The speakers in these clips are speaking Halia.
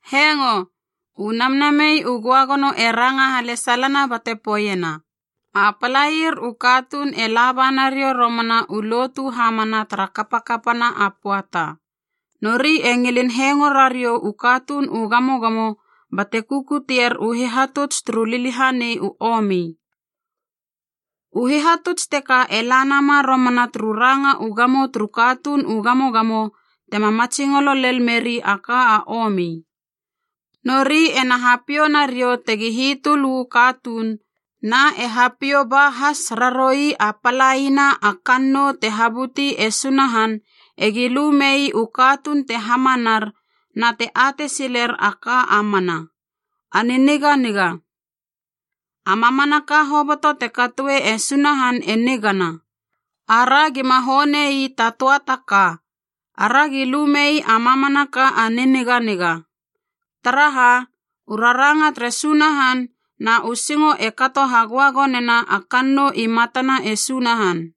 Hengo! U Namnamei u Göagono e ranga halesalana bate poeiena, a palair u katuun e laba nariou romana u lotu hamana tara kapakapana a pöata. Nori e ngilin hengo rariou u katuun u gamogamo bate kukutier u hihatuts turu liliahanei u omi. U hihatuts teka e la nama romana turu ranga u gamo turu katuun u gamogamo tema matsingolo lel meri a ka a omi. Nori ena hapiou nariou tegi hitöl uu katuun, na e hapiou ba has raroui a palaina a kannou te habuti e Sunahan egi lu mei u katuun te hamanar na te atei siler a ka a mana, a niniganiga. A mamanaka hoboto te katoe e Sunahan e nigana, ara gima höanei ta töa ta ka, aragi lu mei a mamanaka a niniganiga. Taraha, u raranga tere Sunahan na u singo e kato hagöagonena a kannou i matana e Sunahan.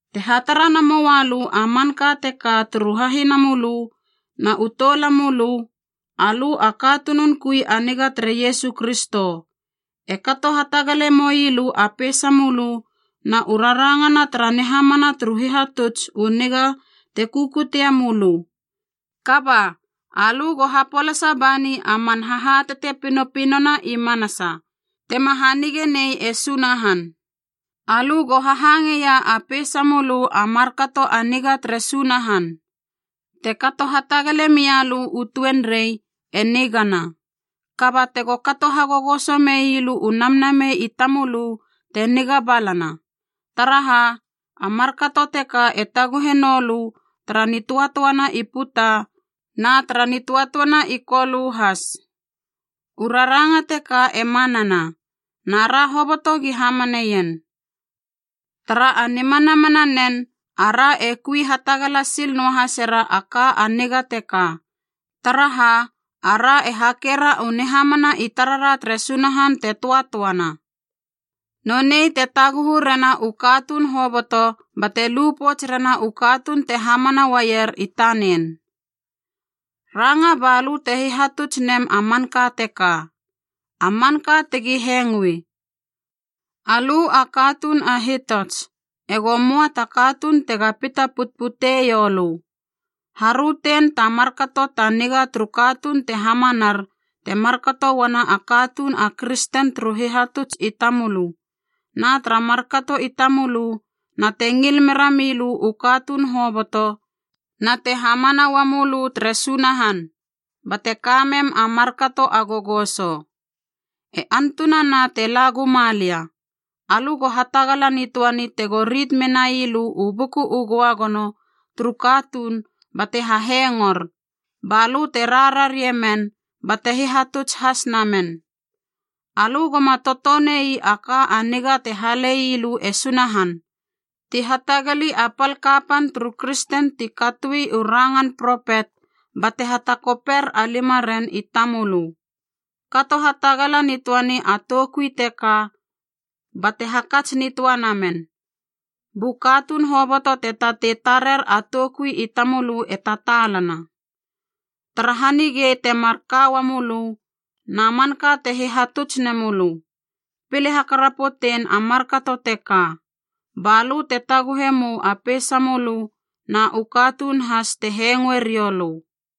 Te hatara namoua lö a manka teka turu hahinamölö na u toulamölö, alö a katunun kui a niga tere Iesu Kristo, e kato hatagale moilö a peisamölö na u rarangana tara nihamana turu hihatuts u niga te kukutie mölö. Kaba, alö go hapolasa bani a man hahatate pinopinona i manasa, tema hanigenei e Sunahan. Alö go hahangeia a peisamölö a markato a niga tere Sunahan. Te kato hatagale mia lö u tuenrei, e nigana. Kaba tego kato hagogoso mei lö u namnamei i tamölö te niga balana, taraha a markato teka e taguhe noulö tara nitöatöana i puta na tara nitöatöana i Kolö has. U raranga teka e manana, na ra hoboto gi hamaneien. Tara a nimanamana nen, ara e kui hatagala sil noahasera a ka a niga teka, taraha ara e hakera u nihamana i tarara tere Sunahan te töatöana. Nonei te taguhu rena u katuun hoboto bate lu pouts rena u katuun te hamana uaier i tanen. Ranga balö te hihatuts nem a manka teka, a manka tegi hengoe. Alö a katuun a hitots, ego möa ta katuun tega pita putputeiou lö. Harötein ta markato ta niga turu katuun te hamanar te markato uana a katuun a kristen turu hihatuts i tamölö, na tara markato i tamölö na te ngil mera milö u katuun hoboto na te hamana ua mölö tere Sunahan, bate ka mem a markato a gogoso. E antunana tena la guma lia, alö go hatagala nitöani tego rit menai lö u Buku u Göagono turu katuun bate hahengor, balö te rararie men bate hihatuts has namen. Alö goma totonei a ka a niga te halei lö e Sunahan, ti hatagali a pal kapan turu kristen ti katoi u rangan propet bate hatakoper a limaren i tamölö. Kato hatagala nitöani a toukui teka bate hakats nitöa namen, bu katuun hoboto te tatei tarer a toukui i tamölö e tataalana. Tara hanigei temar ka uamölö na manka te hihatuts nemölö. Pile hakarapotein a markato teka, ba lö te taguhe mou a peisamölö na u katuun has te hengoe riou lö.